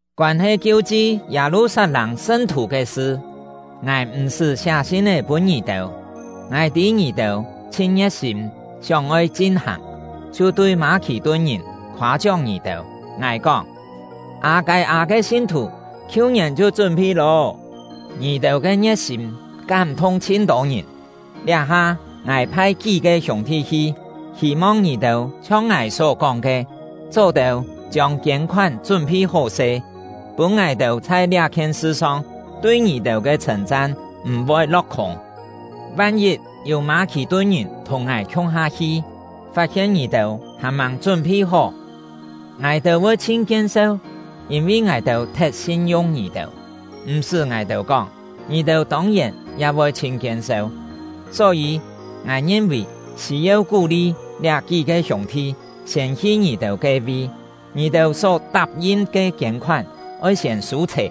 Koân-he kiu-chi Yâ-lu-sat-lâng sṳn-thù ke sṳ, ngài m̀-sṳ́ siá sin-é pûn ngì-têu. Ngài tî ngì-têu chhin ngie̍t-sîm sióng-oi chin-hàng, chhiu tui Mâ-khì-tun-ngìn khoâ-chióng ngì-têu. Ngài kóng: “Â-kâi-â ke sin-thù khiu-ngièn chhiu chún-phi lô.” Ngì-têu ke ngie̍t-sîm kám-thung chhin-tô ngìn. Liá-ha ngài phai kí-ke hiûng-thi hi, hî-mong ngì-têu chhiong ngài só-kóng ke, chó-têu chiông kiên-khoán chún-phi hó-se, pûn ngài-têu chhai liá-khien sṳ-song tui ngì-têu ke chhṳ̂n-chan m̀-voi lo̍k-khûng. Van-yit yû Mâ-khì-tun-ngìn thùng ngài khiung-ha hi, fat-hien ngì-têu hàn-màng chún-phi hó, ngài-têu voi chhin kien-seu, yîn-vi ngài-têu thet sin-yung ngì-têu; m̀-sṳ́ ngài-têu kóng, ngì-têu tông-yèn ya voi chhin kien-seu! Só-yî, ngài ngin-vì sî-yeu kú-li liá kí-ke hiûng-thi siên hi ngì-têu ke-vi. Ngì-têu só tap-yin ke kiên-khoán oi siên sû-chhè,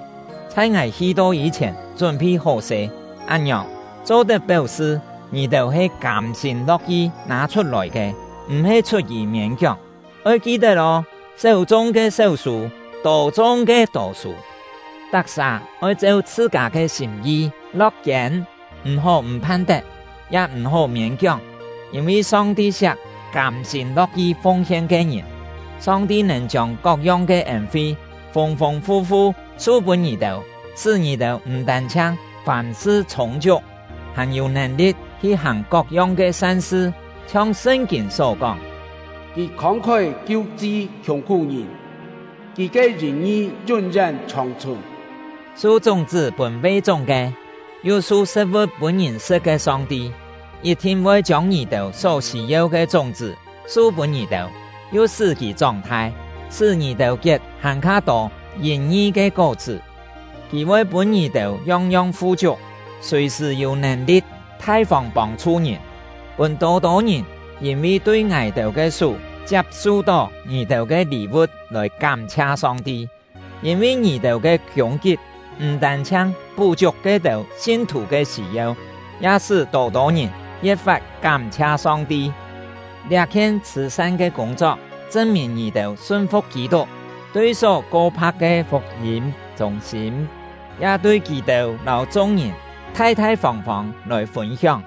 chhai ngài hi-to yî-chhièn chún-phi hó-se; án-ngiòng, cho-tet péu-sṳ ngì-têu he kâm-sîm lo̍k-yi nâ-chhut-lòi ke, m̀-he chhut-yì miên-kióng. Oi ki-tet ô! Séu chung ke séu sû; tô chung ke tô sû. Tak-sà oi cheu chhṳ-kâ ke sîm-yi lo̍k-kiên, m̀-hó m̀ phan-tet, ya m̀-sṳ́ miên-kióng, yîn-vi Song-ti siak kâm-sîm lo̍k-yi fung-hien ke ngìn. Song-ti nèn chiông kok-yong ke ên-fi fûng-fûng fu-fu su-pûn ngì-têu, sṳ́ ngì-têu m̀ tân-chhiang fàm-sṳ chhûng-chiuk, hàn yû nèn-li̍t hi hàng kok-yong ke san-sṳ. Chhiong Sṳn-kîn só kóng: Kì không-khói kiu-chi khiùng-khú-ngìn; kì ke yìn-ngi yún-yén chhòng-chhùn. Su chúng-chṳ́ pûn ve-chúng ke, yu su sṳ̍t-vu̍t pûn ngìn sṳ̍t ke Song-ti, yit-thin voi chiông ngì-têu só sî-yeu ke chúng-chṳ́ su pûn ngì-têu, yu sṳ́ kì chóng-thai, sṳ́ ngì-têu kiet hàn-kha tô yìn-ngi ke kó-chṳ́. Kì voi pûn ngì-têu yong-yong fu-chiuk, sùi-sṳ̀ yû nèn-li̍t thai-fông pông-chhu ngìn, pûn tô-tô ngìn yîn-vi tui ngài-têu ke sú chiap-su-tó ngì-têu ke lî-vu̍t lòi kám-chhia Song-ti. Yîn-vi ngì-têu ke kiûng-kip m̀ tân-chhiang pú-chiuk ke-têu sin-thù ke sî-yeu, ya sṳ́ tô-tô ngìn ye̍t-fat kám-chhia Song-ti. Liá-khien chhṳ̀-san ke kûng-chok chṳn-mìn ngì-têu sun-fu̍k Kî-tuk, tui só ko-pha̍k ke fuk-yîm chûng-sîm, ya tui kì-têu lâu chung-ngìn thai-thai fông-fông lòi fûn-hióng;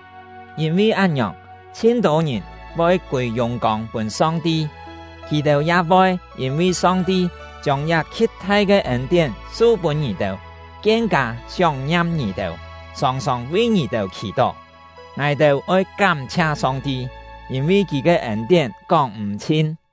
yîn-vi án-ngiòng, chhin-tô ngìn voi kûi yùng-kông pûn Song-ti. Kì-têu ya voi yîn-vi Song-ti chiông liá khi̍t-thai ke ên-tién su-pûn ngì-têu, kien-kâ sióng-ngiam ngì-têu, sòng-sòng vi ngì-têu khì-tó. Ngài-têu oi kám-chhia Song-ti, yîn-vi Kì ke ên-tién kóng-m̀-chhin!